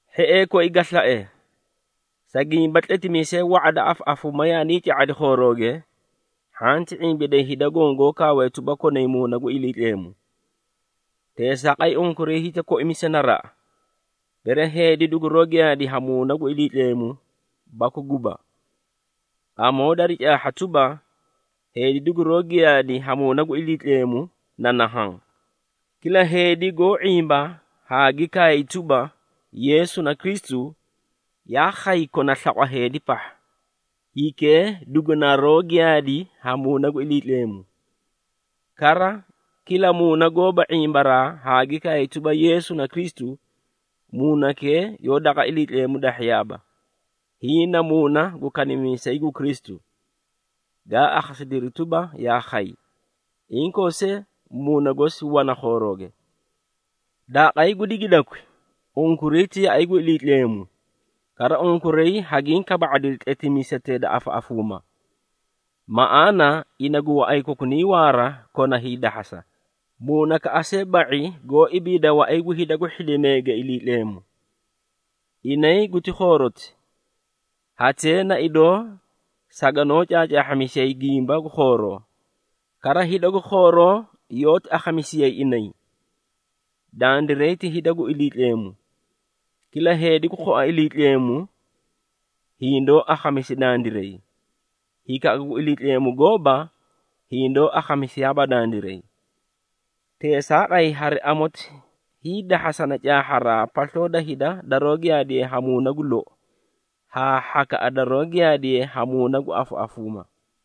Hhiee koi ga slae, sa gimba tletimiisee wa⁄a da afaꞌafuuma yaanii ca⁄iri khoorooge, hhanti ⁄imbiday hida goõ goó kaawee tuba konay Muuna gu Iliitleemu. Teesaaqay, unkuray hiti koimisa naraꞌa, bere heedi duguroó giyaadi ha Muuna gu Iliitleemu baku guba. Amoo dari caahha tuba, heedi duguroó giyaadi ha Muuna gu Iliitleemu na nahaã. Kila heedi goó ⁄imba haa gi kaay tuba, Yeesu na Kristu, yaa khay kona slaqwa heedi pahha, hikee dugunaroó giyaadi ha Muuna gu Iliitleemu. Kara, kila muuna goóba ⁄imbaraa haa gi kaay tuba Yeesu na Kristu, muunakee yoó daqa Iliitleemu dahhiyaaba. Hiĩ na muuna gu kanimiisay gu Kristu, gaa akhasidiri tuba yaa khay, inkoo see muuna gosi wana khoorooge. Daaqay gu digidakwi, unkuray ti yaꞌay gu Iliitleemu, kara unkuray hagiĩ kaba⁄adiri tletimiisetee da afaꞌafuumaa. Maꞌaana ina gu waꞌay kokunay waara kona hiidahhasa, muunakaꞌa see ba⁄i goó ibiida waꞌay gu hida gu hhidimeege Iliitleemu. Inay guti khooroti, hatee na idoo saganoó caacaahhamisiyay gimba gu khooroo, kara hida gu khooroo yoóti akhamisiyay inay. Dandiray ti hida gu Iliitleemu. Kila heedi gu khua Iliitleemu, hindoó akhamisi dandiray, hikaꞌa gu Iliitleemu gooba, hindoó akhamisiyaaba dandiray. Teesaaqay, hari amoti hiidahhasana caahharaa pasloo da hida daroó giyaadiye ha Muuna gu lou, haa hhakaꞌa daroó giyaadiye ha muuna gu afaꞌafuuma.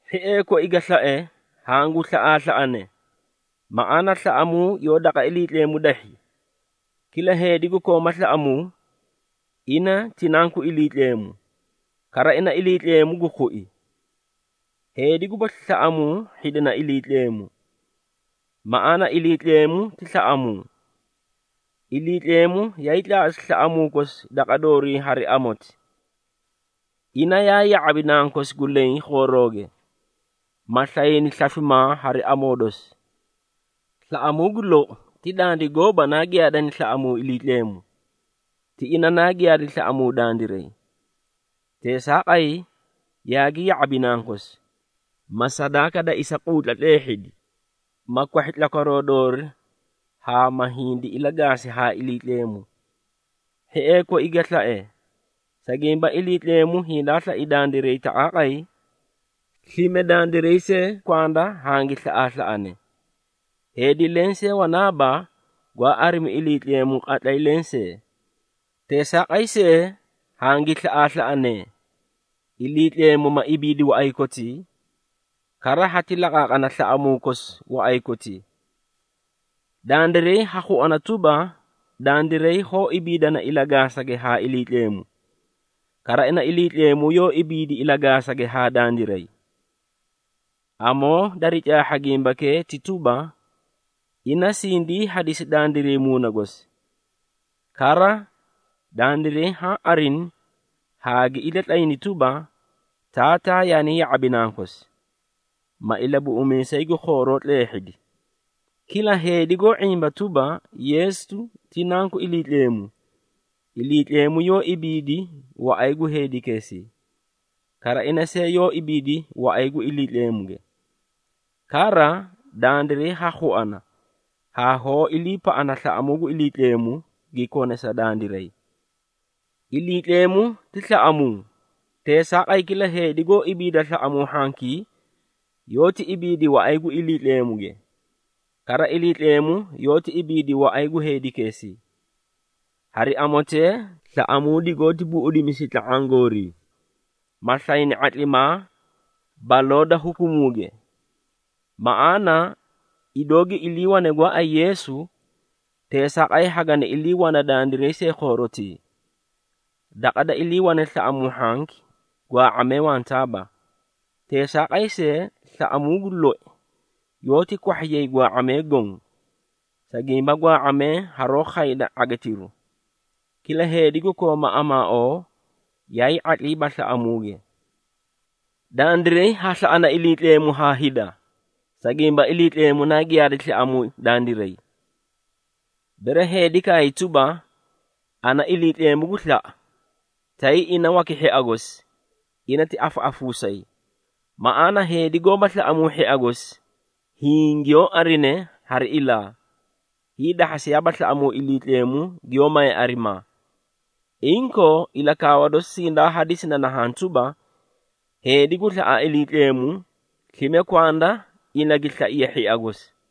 Hhiee koi ga slae, hangu slaꞌaaslaꞌanee, maꞌaana slaꞌamuu yoó daqa Iliitleemu dahhi. Kila heedi gu kooma slaꞌamuu, ina ti nanku Iliitleemu, kara ina Iliitleemu gu khui. Heedi gubasli slaꞌamuu hhidina Iliitleemu, maꞌaana Iliitleemu ti slaꞌamuu. Iliitleemu yaay tlaaꞌasi slaꞌamuu kosi daqa doorii hari amoti. Ina yaa ya⁄abi Nankosi gu leẽ khoorooge, ma slayni slafimaa hari amoo dosi. Slaꞌamuu gu lou ti dandiray gooba naa giyaadani slaꞌamuu Iliitleemu, ti ina naa giyaadi slaꞌamuu dandiray. Teesaaqay, yaagi ya⁄abi Nankosi, ma sadaaka da isahiiquutla tleehhidi, ma kwahhi tlakwaroo doori haa ma hindi ilagaasi haa Iliitleemu. Hhiee koi ga slae, sa gimba Iliitleemu hindaa slai dandiray taqaaqay, slime dandiray see kwanda hangi slaꞌaaslaꞌanee. Heedi lensee wanaaba, gwaa arimu Iliitleemu qatlay lensee. Teesaaqay see, hangi slaꞌaaslaꞌanee, Iliitleemu ma ibiidi waꞌay kotii, kara hati laqaaqana slaꞌamuu kosi waꞌay kotii. Dandiray ha khuana tuba, dandiray hoó ibiidana ilagaasage haa Iliitleemu, kara ina Iliitleemu yoó ibiidi ilagaasage haa dandiray. Amoo dari caahha gimbakee ti tuba, ina sindii hadisi dandiray Muuna gosi. Kara, dandiray haã arini haa gi ilatlayni tuba, Taataa yaani ya⁄abi Nankosi, ma Ilabuꞌumiisay gu khooroo tleehhidi. Kila, heedi goó ⁄imba tuba, Yeesu ti Nanku Iliitleemu, Iliitleemu yoó ibiidi waꞌay gu heedikeesii, kara ina see yoó ibiidi waꞌay gu Iliitleemuge. Kara, dandiray ha khuana haa hoó iliipaꞌana slaꞌamuu gu Iliitleemu gi kone sa dandiray. Iliitleemu ti slaꞌamuu, teesaaqay kila heedi goó ibiidi slaꞌamuu hhankii, yoóti ibiidi waꞌay gu Iliitleemuge. Kara Iliitleemu yoóti ibiidi waꞌay gu heedikeesii. Hari amotee, slaꞌamuu digoóti buꞌudimisi tla⁄aã goorii, ma slayni ⁄atlimaa baloo da hukumuuge. Maꞌaana, idoo gi iliiwane gooay Yeesu, teesaaqay hagani ilii wana dandiray see khoorotii. Daqa da iliiwane slaꞌamuu hhanki gwaa⁄amee wantaaba. Teesaaqay see, slaꞌamuu gu loi yoóti kwahhiyay gwaa⁄amee goõ, sa gimba gwaa⁄amee haroó khayda ⁄agitiru. Kila heedi gu kooma amaaoo, yaay ⁄atliiba slaꞌamuuge. Dandiray ha slaꞌana Iliitleemu haa hida, sa gimba Iliitleemu naa giyaadi slaꞌamuu dandiray. Bere heedi kaay tuba, “Ana, Iliitleemu gu slaꞌa,” tay ina waki hhia gosi, ina ti afaꞌafuusayi. Maꞌaana heedi goóba slaꞌamuu hhia gosi hiĩ giyoó arine hari ilaa, hiidahhasiyaaba slaꞌamuu Iliitleemu giyoó maye arimaa. Inkoo, ilakaawa dosi sindaa hadisi na nahaã tuba, heedi gu slaꞌa Iliitleemu, slime kwanda ina gi slaiye hhia gosi.